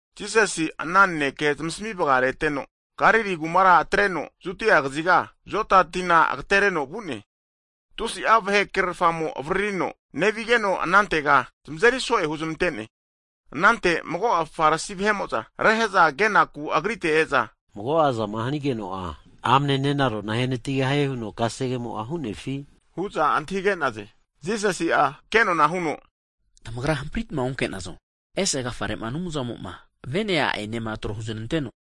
Jisasi'a ana naneke zamasmi vagareteno, Galili kumara atreno, Judia kaziga, Joda tina agatereno vu'ne. Tusi'a vahe krerfamo'za avaririza nevazageno, anantega zamazeri so'e huzmante'ne. Anante mago'a Farisi vahe'mo'za rehe'za kenaku Agrite e'za, mago'azama hanigeno'a amne nenarona ahenatigahie huno kasegemo'a hu'nefi? hu'za antahige'naze. Jisasi'a ke nona huno, Tamagra hampritma onke'nazo, ese agafare'ma Anumzamo'ma vene, a'enema tro huneznanteno,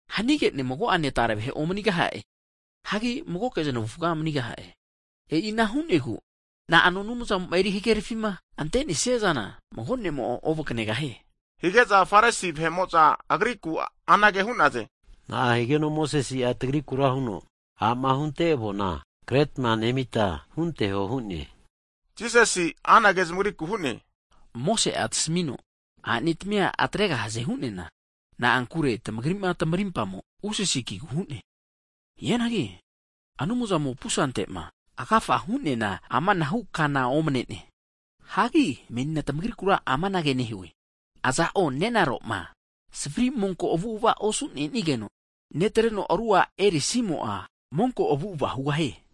Hanige'ne, mago'ane tare vahe omanigaha'e. Hagi magoke znavufa manigaha'e. E'ina hu'negu na'ano Anumzamo'ma eri hagerfima ante'nesia zana, mago ne'mo'a ovakanegahie. Hige'za Farisi vahe'mo'za Agriku anage hu'naze. Na'a higeno Mosese'a tagrikura huno, a'ma hunte avona kretma nemita hunteho hu'ne? Jisasi'a anage zamagriku hu'ne, Mose'a tamasmino a'netmia atregahaze hu'neana, na'ankure tamagri'ma tamarimpamo usasi ki'negu hu'ne. Hianagi Anumzamo pusanteti'ma agafa hu'neana amanahu kana omne'ne. Hagi menina tmagrikura amanage nehue, Aza'o nenaro'ma savri monko avu'ava osu'nesigeno netreno ru a' erisimo'a, monko avu'ava hugahie.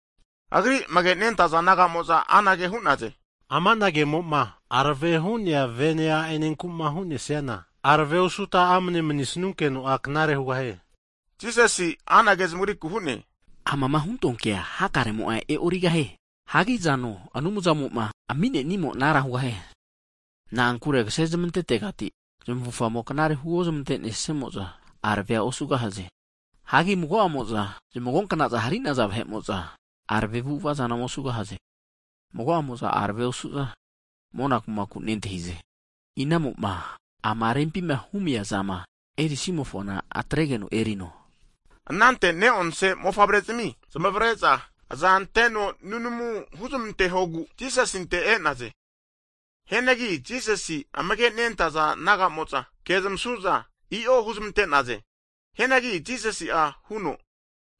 Agri amage nentaza disaipol naga'mo'za anage hu'naze, Amana ke'mo'ma arave hu'nea vene a'enenku'ma hu'nesiana, arave osuta amane manisnunkeno'a knare hugahie. Jisasi'a anage zamagriku hu'ne. Amama huntoa kea, hakaremo'a e'origahie. Hagi azano Anumzamo'ma ami'nenimo anara hugahie. Na'ankure kase zmantetegati zmufamo knare huozmante'nesamo'za arave osugahaze. Hagi mago'amo'za zmagonkna'za hari'naza vahe'mo'za arave avu'ava zana osugahaze, mago'amo'za arave osu'za mona kumaku nentahize. Inamo'ma ama rempima humi kema humiazama erisimofona atregeno erino. Anante ne'onse mofavrezimi zamavare'za aza anteno nunamu huzmantesiegu Jisasinte e'naze. Hianagi Jisasima amage nentaza disaipol naga'mo'za ana vahera ke zamasu'za, i'o huzmante'naze. Hianagi Jisasi'a huno,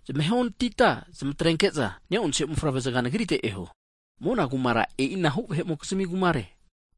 Zamahe onatita zamatrenke'za ne'onse mofavre zaga Nagrite eho, mona kumara e'ina hu vahe'mokizmi kumare,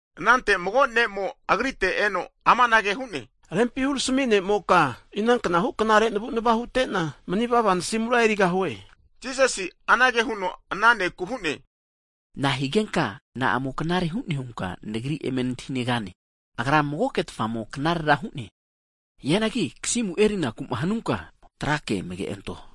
Anante mago ne'mo Agrite eno amanage hu'ne, Rempi hurami ne'moka, inanknahu knare navunava hutena mani vava nasimura erigahue? Higeno Jisasi'a anage huno ana ne'ku hu'ne, Nahigenka na'amo knare hune hunka Nagrira eme nantahinegane? Agra magoketfamo knarera hu'ne. Hianagi kasimu erinaku'ma hanunka, kasege amage'anto,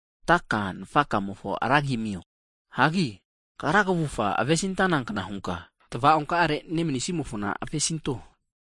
antaka'ane nafaka'mofonena ra zanagi zanamio. Hagi kagra kavufga avesi antanankna hunka tava'onkare nemanisimofona avesinto.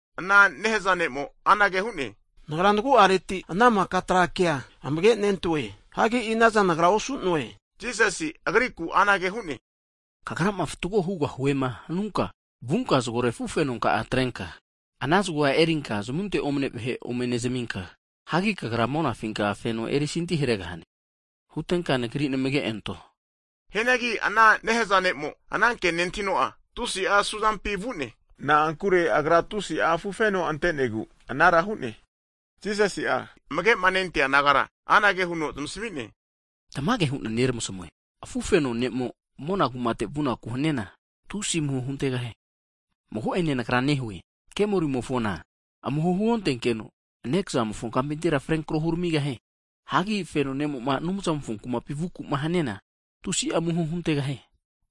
Ana nehazave ne'mo, anage hu'ne, nagra nagu'areti ana miko kasegea amage'nentoe, hagi inaza nagra nosue? Higeno Jisasi'a agrikura anage hu'ne, Kagrama fatgo hugahuema hanunka, vunka zagore afufenonka'a ome atrenka, ana zagoa erinka zamunte omne vahe ome nezminka, hagi kagra monafinka feno eri santi haregahane. Hutenka Nagrira eme namage anto. Hianagi ana nehaza'mo'ma anankema nentahino'a, tusi'a asuzampi vu'ne. Na'ankure agra tusi'a afufeno ante'negu anara hu'ne. Jisasi'a amage'ma nentaza disaipol nagara anage huno zamasami'ne, Tamage hu'na neramasmue, afufeno ne'mo mona kumate vunaku haniana, tusi amuho huntegahie. Mago'ene Nagra nehue, kemolimofona amuho huontenkeno nekazamofo kampintira frenkro huramigahie. Hagi feno ne'mo'ma Anumzamofo kumapi vuku'ma haniana, tusi'a amuho huntegahie.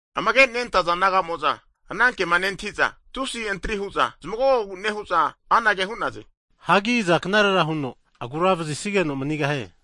Amage nentaza disaipol naga'mo'za, ana kema nentahiza, tusi antri hu'za zmagogogu nehu'za anage hu'naze. Hagi aza knare huno agura vazisigeno manigahie hu'naze.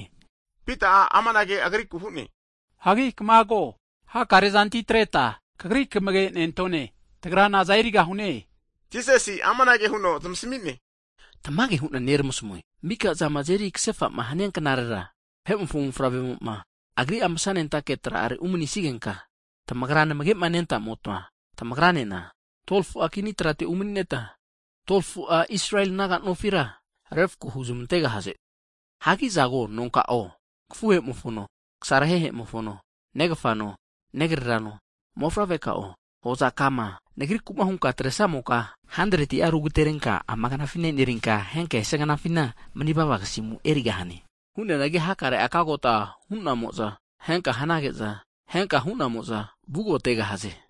Higeno Pita'a amanage agrikura hu'ne, hagi kamago. Hakare zanti atreta Kagri kamage nentone! Tagra naza erigahune? Higeno, Jisasi'a amanage huno zamasmi'ne, Tamage hu'na neramasmue. Miko zama azeri kasefa'ma hania knarera, Vahe'mofo mofavremo'ma, Agri'a masanentake tra'are umanisigenka, tamagrama namage'ma nentamotma tamagranena 12fu'a kini trate umani'neta, 12fu'a Israeli naga nofira refako huzmantegahaze. Hagi azago, nonka'o, kafuhe'mofono, kasarahehe mofono, negafano, negrerano, mofavre'kao, hoza'ka'ama Nagri'kuma hunka atresamoka, 100'a rugaterenka ama knafina enerinka, henka esia knafina manivava kasimu erigahane. Hu'neanagi hakare ugagota hu'namo'za ehenka hanageno, ehenka hu'namo'za vugagota hugahaze.